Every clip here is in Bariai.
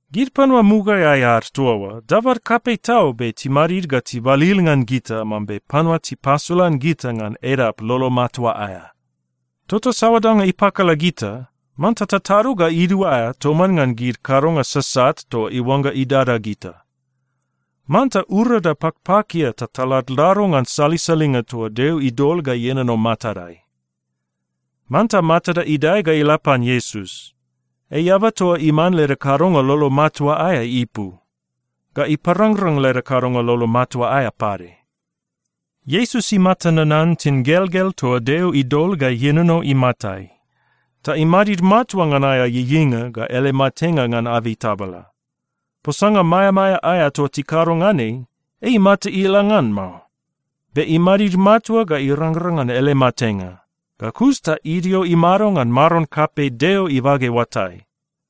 Gid panua mugaeai ad toa oa dabad kapei tau be timadid ga tibalil ngan gita mambe panua tipasolan gita ngan edap lolo matua aea. Tota saoa danga ipakala gita, manta tatado ga iduaea toman ngan gid kadonga sasat toa iuangga idada gita. Manta urada pakpakia ta taladlado ngan salisalinga toa Deo idol ga ienono matadai. Manta matada idae ga ila pan Iesus. Ei eaba toa iman leda kadonga lolo matua aea ipu, ga iparangrang leda kadonga lolo matua aea pade. Iesus imata nanan tingelgel toa Deo idol ga ienono imatai, ta imadid matua ngan aea ieieinga ga ele matenga ngan abei tabala. Posanga maeamaea aea toa tikado ngan ei, ei imata ila ngan mao. Be imadid matua ga irangrang ngan ele matenga. Ga kus ta idio imado ngan Maron kapei Deo ibage oatai.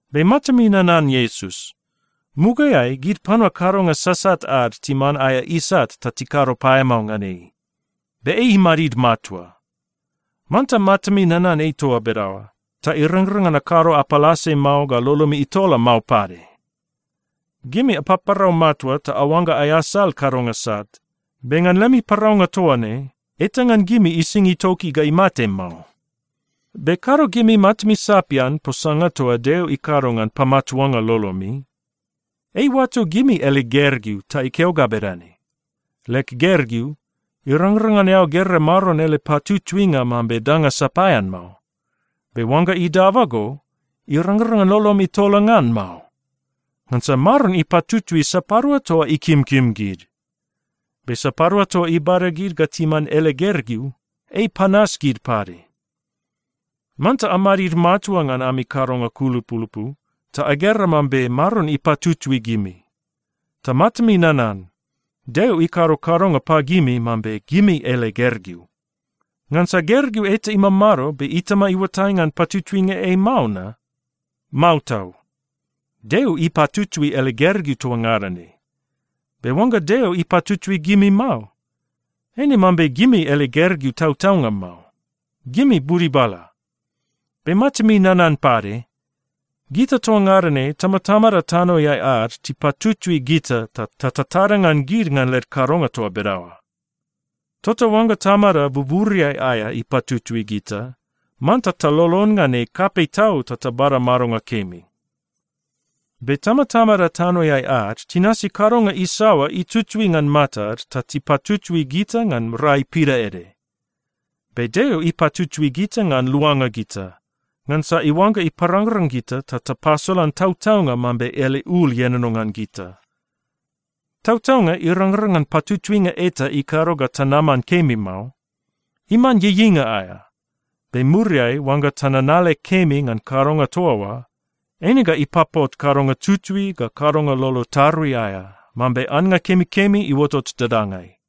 Be matami nanan Iesus. Mugaeai gid panua kadonga sasat ad timan aea isat ta tikado paeamao ngan ei, be ei imadid matua. Manta matami nanan ei toa bedaoa, ta irangrang ngan akado apalase mao ga lolomi itola mao pade. Gimi apaparau matua ta aoangga aeasal kadonga sat, be ngan lemi paraunga toa ne, eta ngan gimi ising itoki ga imate mao. Be kado gimi matami sapian posanga toa Deo ikado ngan pamatuanga lolomi. Ei iuato gimi ele gergeu ta ikeo ga bedane, “Leg gergeu, irangrang ngan eao gera Maron ele patutuinga mambe danga sapaean mao. Be oangga idaba go, irangrang ngan lolom itola ngan mao. Ngansa Maron ipatutui sapadua toa ikimkim gid. Be sapadua toa ibada gid ga timan ele gergeu, ei ipanas gid pade.” Manta amadid matua ngan ami kadonga kulupulupu ta agera mambe Maron ipatutui gimi. Ta matami nanan: Deo ikado kadonga pagimi mambe gimi ele gergeu. Ngansa gergeu eta imamado be itama iuatai ngan patutuinga ei mao na? Mao tau. Deo ipatutui ele gergeu toa ngada ne. Be oangga Deo ipatutui gimi mao, eine mambe gimi ele gergeu tautaunga mao. Gimi budibala. Be matami nanan pade, gita toa ngada ne tamatamada tanoeai ad tipatutui gita, ta tatada ngan gid ngan led kadonga toa bedaoa. Tota oangga Tamada buburiai aea ipatutui gita, manta talolon ngan ei kapei tau ta tabada madonga kemi. Be tamatamada tanoeai ad tinasi kadonga isaoa itutui ngan matad ta tipatutui gita ngan rai pidaede. Be Deo ipatutui gita ngan luanga gita, ngansa iuangga iparangrang gita ta tapasolan tautaunga mambe ele ul ienono ngan gita. Tautaunga, irangrang ngan patutuinga eta ikado ga tanaman kemi mao. Iman ieieinga aea. Be muriai oangga tananale kemi ngan kadonga toa oa, eine ga ipapot kadonga tutui ga kadonga lolo tarui aea, mambe annga kemikemi iuotot dadangai.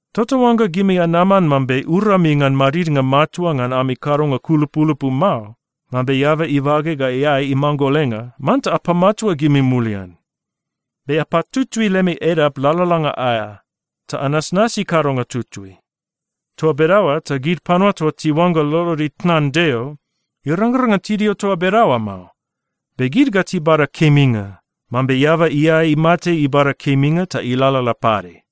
Tota oangga gimi anaman mambe urami ngan madidnga matua ngan ami kadonga kulupulupu mao, mambe eaba ibage ga iae imanggolenga, manta apamatua gimi mulian. “Be apatutui lemi edap lalalanga aea, ta anasnasi kadonga tutui.” Toa bedaoa ta gid panua toa tiuangga lolod itnan Deo, irangrang ngan tidio toa bedaoa mao, be gid ga tibada keminga, mambe eaba iae imate ibada keminga ta ilalala pade.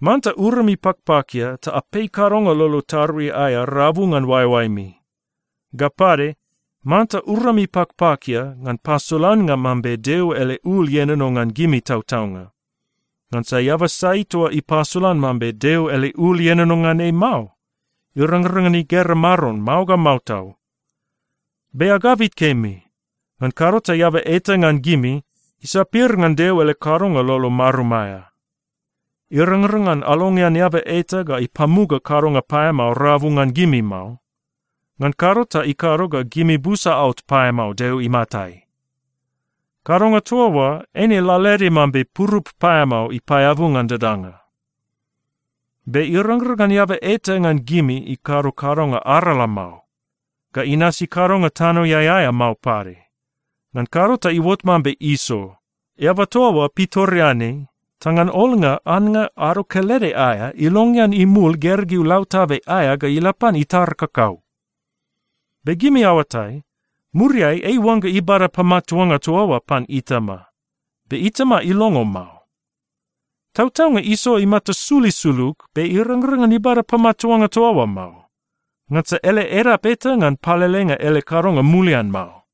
Manta urami pakpakia ta apei kadonga lolo tarui aea rabu ngan oaeoaemi. Ga pade, manta urami pakpakia ngan pasolannga mambe Deo ele ul ienono ngan gimi tautaunga. Ngansa eaba sai toa ipasolan mambe Deo ele ul ienono ngan ei mao, irangrang ngan igera Maron mao ga mao tau. Be agabit kemi, ngan kado ta eaba eta ngan gimi isapir ngan Deo ele kadonga lolo marum aea. Irangrang ngan alongean eaba eta ga ipamuga kadonga paeamao rabu ngan gimi mao. Ngan kado ta ikado ga gimi busa aot paeamao Deo imatai. Kadonga toa oa eine lalaede mambe purup paeamao ipaeabu ngan dadanga. Be irangrang ngan eaba eta ngan gimi ikado kadonga arala mao, ga inasi kadonga tanoeai aea mao pade. Ngan kado ta iuot mambe Iso. Eaba toa oa pitoreanei, ta ngan olnga annga ado kelede aea, ilongean imul gergeu lautabe aea ga ila pan itar kakau. Be gimi aoatai, muriai ei iuangga ibada pamatuanga toa oa pan itama, be itama ilongo mao. Tautaunga Iso imata sul isulug, be irangrang ngan ibada pamatuanga toa oa mao, ngansa ele edap eta ngan palelenga ele kadonga mulian mao.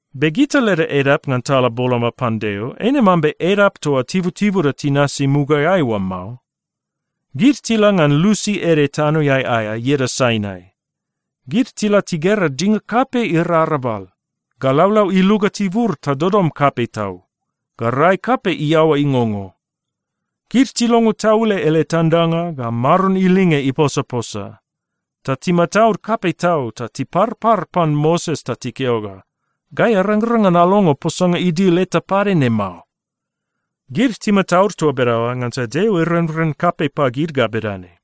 Be gita leda edap ngan tala boloma pan Deo, eine mambe edap toa tibutibuda tinasi mugaeai oa mao. Gid tila ngan lusi ede tanoeai aea ieda Sainai. Gid tila tigera dinga kapei irarabal, ga laulau iluga tibur ta dodom kapei tau, ga rai kapei iaoa ingongo. Gid tilongo taule ele tandanga ga Maron ilinge iposaposa, ta timataud kapei tau ta tiparpar pan Moses ta tikeo ga, “Gai arangrang ngan alongo posanga idil eta pade ne mao.” Gid timataud toa bedaoa ngansa Deo irenren kapei pagid ga bedane,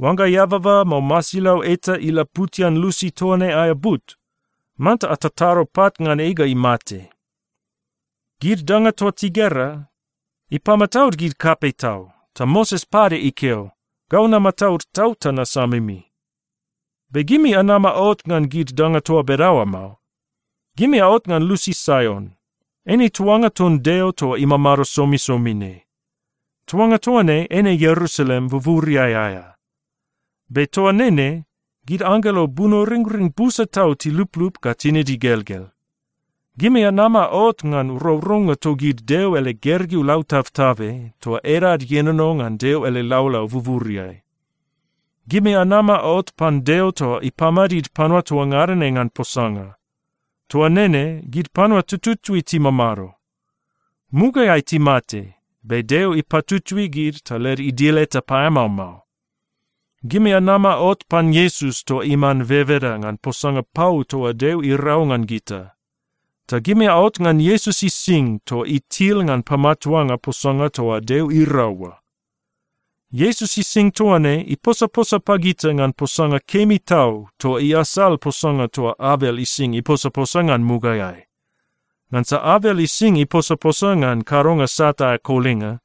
“Oangga eababa mao masilau eta ilaputian lusi toa ne aea but, manta atatado pat ngan ei ga imate.” Gid danga toa tigera, ipamataud gid kapei tau, ta Moses pade ikeo, “Gau namataud tau ta nasamimi.” Be gimi anama aot ngan gid danga toa bedaoa mao. Gimi aot ngan lusi Saion, eine tuanga ton Deo toa imamado somisomi ne. Tuanga toa ne eine Ierusalem buburiai aea. Be toa nene, gid anggelo bunoringring busa tau tiluplup ga tinid igelgel. Gimi anama aot ngan rourounga togid Deo ele gergeu lautabtabe, toa edad ienono ngan Deo ele laulau buburiai. Gimi anama aot pan Deo toa ipamadid panua toa ngada ne ngan posanga. Toa nene gid panua tututui timamado. Mugaeai timate, be Deo ipatutui gid ta led idil eta paeamao mao. Gimi anama aot pan Iesus toa iman bebeda ngan posanga pau toa Deo irau ngan gita. Ta gimi aot ngan Iesus ising toa itil ngan pamatuanga posanga toa Deo irau oa. Iesus ising toa ne iposaposa pagita ngan posanga kemi tau toa iasal posanga toa Abel ising iposaposa ngan mugaeai. Ngansa Abel ising iposaposa ngan kadonga sat aea kolinga,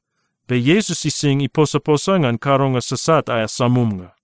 be Iesus ising iposaposa ngan kadonga sasat aea samumnga.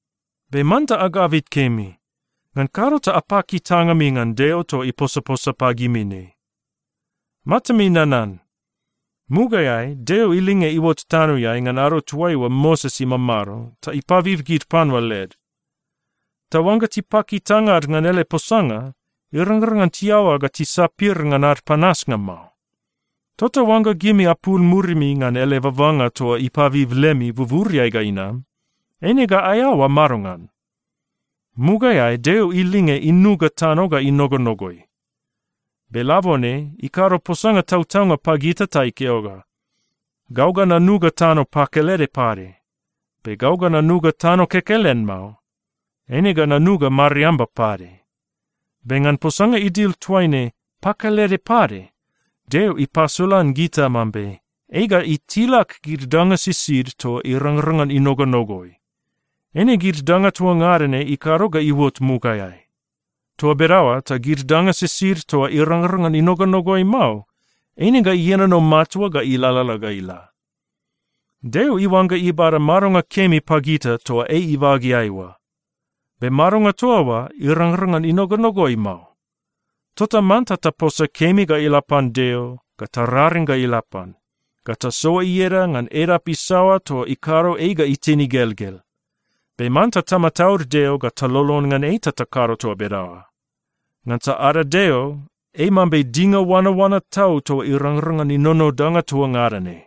Be manta agabit kemi. Ngan kado ta apaki tangami ngan Deo toa iposaposa pagimi ne. Matami nanan. Mugaeai Deo ilinge iuot tanoeai ngan ado toaiua Moses imamado ta ipabib gid panua led. Ta oangga tipaki tangad ngan ele posanga, irangrang ngan tiaoa ga tisapir ngan ad panasnga mao. Tota oangga gimi apul murimi ngan ele babanga toa ipabib lemi buburiai ga inam, eine ga aeaoa madongan? Mugaeai Deo ilinge inuga tano ga inogonogoi. Be labone ikado posanga tautaunga pagita ta ikeo ga, “Gau ga nanuga tano pakelede pade. Be gau ga nanuga tano kekelen mao. Eine ga nanuga mariamba pade.” Be ngan posanga idil toaine “pakelede pade,” Deo ipasolan gita mambe ei ga itilak gid danga sisid toa irangrang ngan inogonogoi. Eine gid danga toa ngada ne ikado ga iuot mugaeai. Toa bedaoa ta gid danga sisid toa irangrang ngan inogonogoi mao, eine ga ienono matua ga ilalala ga ila. Deo iuangga ibada madonga kemi pagita toa ei ibageai oa. Be madonga toa oa irangrang ngan inogonogoi mao. Tota manta taposa kemi ga ila pan Deo, ga tararing ga ila pan, ga tasoa ieda ngan edap isaoa toa ikado ei ga itin igelgel. Be manta tamataud Deo ga talolon ngan ei ta takado toa bedaoa. Ngansa ada Deo, ei mambe dinga oanaoana tau toa irangrang ngan inono danga toa ngada ne.